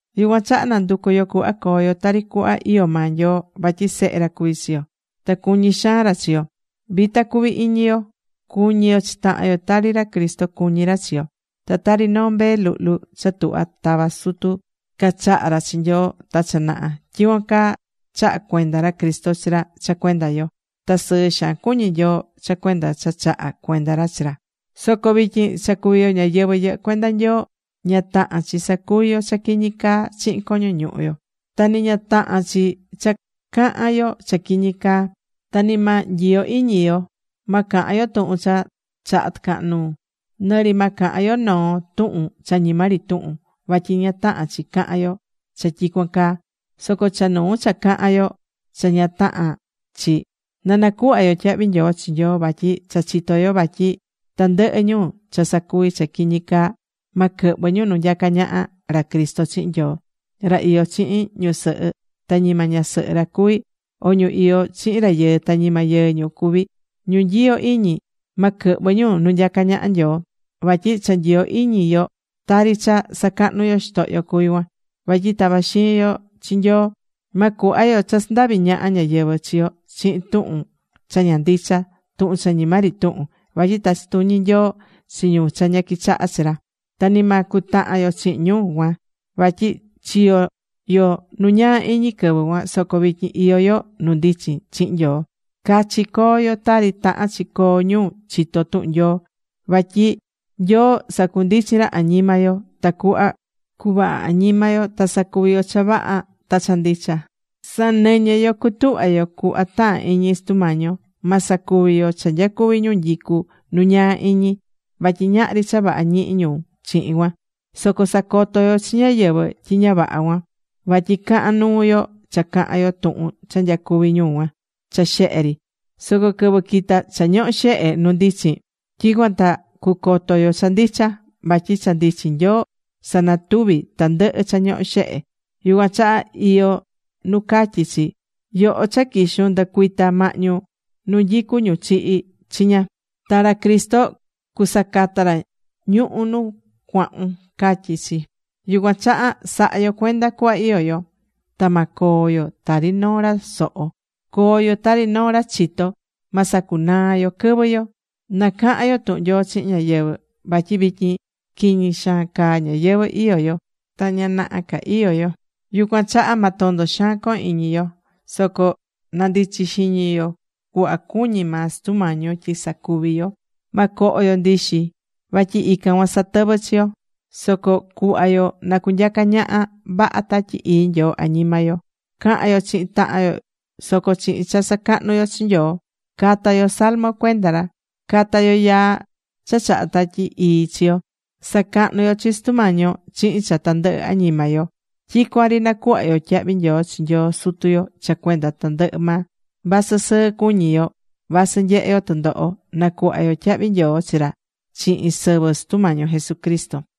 Yucuan chaha na̱nducu yo cuhva coo yo tari cuhva iyó maa Nyoo. Vatyi sehe ra cuví chi yo. Ta cuñí xaan ra chi yo. Vita cuvi iñi yo. Cu̱ñi yo chi tahan yo, tari ra Cristo cuñí ra chi yo. Ta tari noo mbee luhlu cha tuhva̱ tata sutu cachaha̱ ra chi Nyoo ta cha naha, tyicuan caa chaha̱ cuenda ra Cristo chi ra cha cuenda yo. Ta sɨɨ xaan cuñí Nyoo cha cuenda cha chaha̱ cuenda ra chi ra. Soco vityin cha cuví yo ñáyɨvɨ yɨhɨ́ cuenda Nyoo, ña tahán chi sacuví yo cha quiñi caa chihin coño ñuhu yo. Nɨ ña tahán chi cha cahán yo cha quiñi caa. Ta ni ma nyiyo iñi yo. Ma cahan yo tuhun cha chahá tɨcahan nuu. Nɨ ri ma cahan yo noo tuhun cha ñima ri tuhun. Vatyi ña tahán chi cahan yo cha tyicuan caa. Soco cha nuu cha cahán yo cha ña tahán chi, na nacuhva yo tyahvi nyoo chi Nyoo. Vatyi cha chitó yo vatyi tandɨhɨ ñu cha sacuví cha quiñi caa, ma quɨhvɨ ñu nu nyacá ñaha ra Cristo chihin Nyoo. Ra iyó chihin ñusɨhɨ ta ñima ñasɨhɨ ra cuví, o ñu iyó chihin rayɨɨ ta ñima yɨɨ ñu cuví, ñu nyiyó iñi, ma quɨhvɨ ñu nu nyacá ñaha Nyoo. Vatyi cha nyiyó iñi yo tari cha sacahnú yo xitohyo cuví cuan. Vatyi tavá xiin yo chi Nyoo. Ma cuhva yo cha sandavi ñaha ñáyɨvɨ chi yo chihin tuhun cha ña ndicha, tuhun cha ñima ri tuhun. Vatyi tachí tuñi Nyoo chi ñu cha ña quichahá chi ra. Ta ni ma cutahan yo chihin ñu cuan. Vatyi chiyo̱ yo nu ñaa iñi quɨvɨ cuan. Soco vityin iyó yo nu ndichin chihin Nyoo. Cachi co̱o yo tari tahán chi coo ñu chitó tuhun Nyoo. Vatyi Nyoo sacundichín ra añima yo tacuhva cuvaha añima yo ta sacuvi yo cha vaha ta cha ndicha. Sa̱nɨñɨ yo cutuhva yo cuhva tahán iñi Sutu Mañi yo. Ma sacuvi yo cha nyacuví ñu nyicú nu ñaa iñi. Vatyi ñahri cha vaha ñihí ñu chihin cuan. Soco sa̱coto yo chi ñáyɨvɨ tyi ña vaha cuan. Vatyi cahán nuu yo cha cahán yo tuhun cha nyacuví ñu cuan cha xehe ri. Soco quɨvɨ quita cha ñohó xehe nu ndichin, tyicuan ta cucoto yo cha ndicha. Vatyi cha ndichin Nyoo sanatuví tandɨhɨ cha ñohó xehe. Yucuan chaha iyó nu catyí chi: Yoho cha quixun, ndɨ̱cuita mahñu nu nyicú ñu chihi̱ chiña. Ta ra Cristo cusacata ra ñuhu̱ nu cuahún, catyí chi. Yucuan chaha sa̱ha yo cuenda cuhva iyó yo. Ta ma coo yo tari noo ra soho. Co̱o yo tari noo ra chitó. Ma sacunaa yo quɨvɨ yo. Na cahan yo tuhun Nyoo chihin ñáyɨvɨ. Vatyi vityin quiñi xaan caa ñayɨvɨ̱ iyó yo, ta ña naha ca iyó yo. Yucuan chaha ma tondo xaan cohon iñi yo. Soco na̱ndichi xiñi yo cuhva cuñí maa Sutu Mañi yo tyi sacuvi yo. Ma coho yo ndixi. Vatyi ican cuan satɨvɨ́ chi yo. Soco cuhva yo na cunyaca ñaha vaha Tatyi Ii Nyoo añima yo. Ca̱han yo chihin tahan yo soco chihin cha sacahnú yo chi Nyoo. Ca̱ta yo salmo cuenda ra. Ca̱ta yo yaa cha chahá Tatyi Ii chi yo. Sa̱cahnu yo chi Sutu Mañi yo chihin cha tandɨhɨ añima yo. Tyicuan ri na̱cuhva yo tyahvi nyoo chi Nyoo Sutu yo cha cuenda tandɨhɨ maa, vasɨ sɨɨ cuñí yo, vasɨ nyehé yo tɨndoho. Na̱cuhva yo tyahvi nyoo chi ra chihin sɨvɨ Sutu Mañi yo Jesucristo.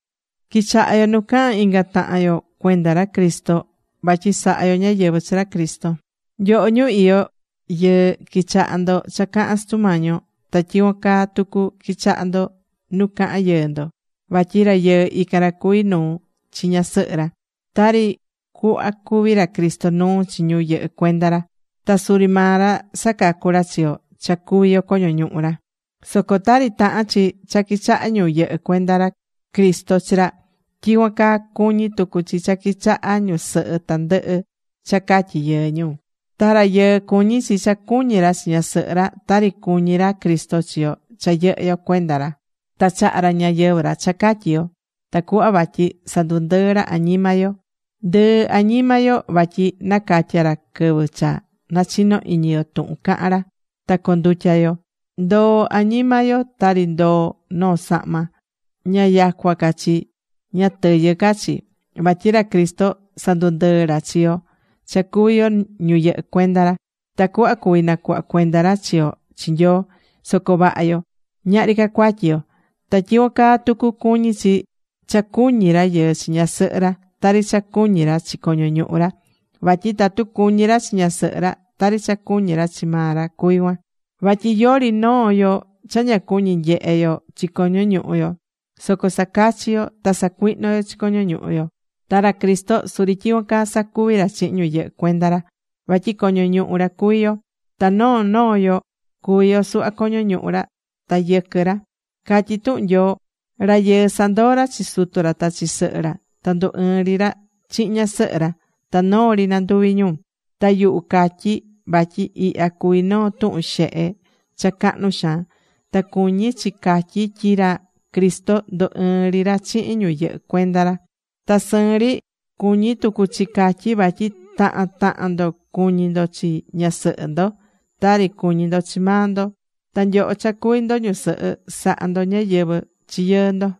Qui̱chaha yo nu cahán inga tahan yo cuenda ra Cristo. Vatyi sahá yo ñáyɨvɨ chi ra Cristo. Nyoho ñu iyó yɨɨ qui̱chaha ndo cha cahán Sutu Mañi yo. Ta tyicuan caa tucu qui̱chaha ndo nu cahán yɨɨ ndo. Vatyi rayɨɨ ican ra cuví nuu chi ñasɨhɨ ra, tari cuhva cuví ra Cristo nuu chi ñu yɨhɨ́ cuenda ra. Ta suri maa ra sacacú ra chi yo cha cuví yo coño ñuhu ra. Soco tari tahán chi cha quichahá ñu yɨhɨ́ cuenda ra Cristo chi ra, tyicuan caa cuñí tucu chi cha quichahá ñusɨhɨ tandɨhɨ cha catyí yɨɨ ñu. Ta rayɨɨ cuñí chi cha cuñí ra chi ñasɨhɨ ra, tari cuñí ra Cristo chi yo cha yɨhɨ́ yo cuenda ra. Ta chaha̱ ra ñayɨvɨ̱ ra cha catyi yo. Tacuhva vatyi sandundɨɨ ra añima yo. Ndɨɨ añima yo vatyi nacatya̱ ra quɨvɨ cha nachino iñi yo tuhun cahán ra ta condutya̱ yo. Ndoo̱ añima yo tari ndoo̱ noo sahma, ña yacua ca chi, ña tɨyɨ ca chi. Vatyi ra Cristo sandundɨɨ́ ra chi yo cha cuví yo ñu yɨhɨ́ cuenda ra. Tacuhva cuví nacuhva cuenda ra chi yo chi Nyoo, soco vaha yo, ñahri ca cuatyi yo. Ta tyicuan caa tucu cuñí chi cha cuñí rayɨɨ chi ñasɨhɨ ra, tari cha cuñí ra chi coño ñuhu ra. Vatyi tatu cuñí ra chi ñasɨhɨ ra, tari cha cuñí ra chi maa ra cuví cuan. Vatyi yori noo yo cha ña cuñi nyehe yo chi coño ñuhu yo. Soco sacachí yo ta sacuihnó yo chi coño ñuhu yo. Ta ra Cristo suri tyicuan caa sacuví ra chihin ñu yɨhɨ́ cuenda ra. Vatyi coño ñuhu ra cuví yo. Ta noo noo yo cuví yo suhva coño ñuhu ra ta yɨquɨ ra. Catyí tuhun Nyoo: “Rayɨɨ sandoó ra chi sutu ra ta chi sɨhɨ ra. Ta ndu ɨɨ́n ri ra chihin ñasɨhɨ ra. Ta noo ri nanduví ñu.” Ta yuhu catyi vatyi ihya cuví noo tuhun xehe cha cahnu xaan. Ta cuñí chi catyi tyi ra Cristo ndu ɨɨ́n ri ra chihin ñu yɨhɨ́ cuenda ra. Ta sɨɨn ri cuñí tucu chi catyi vatyi tahan tahan ndo cuñí ndo chi ñasɨhɨ ndo, tari cuñí ndo chi maa ndo. Ta nyoho cha cuví ndo ñusɨhɨ, sa̱ha ndo ñáyɨvɨ chi yɨɨ ndo.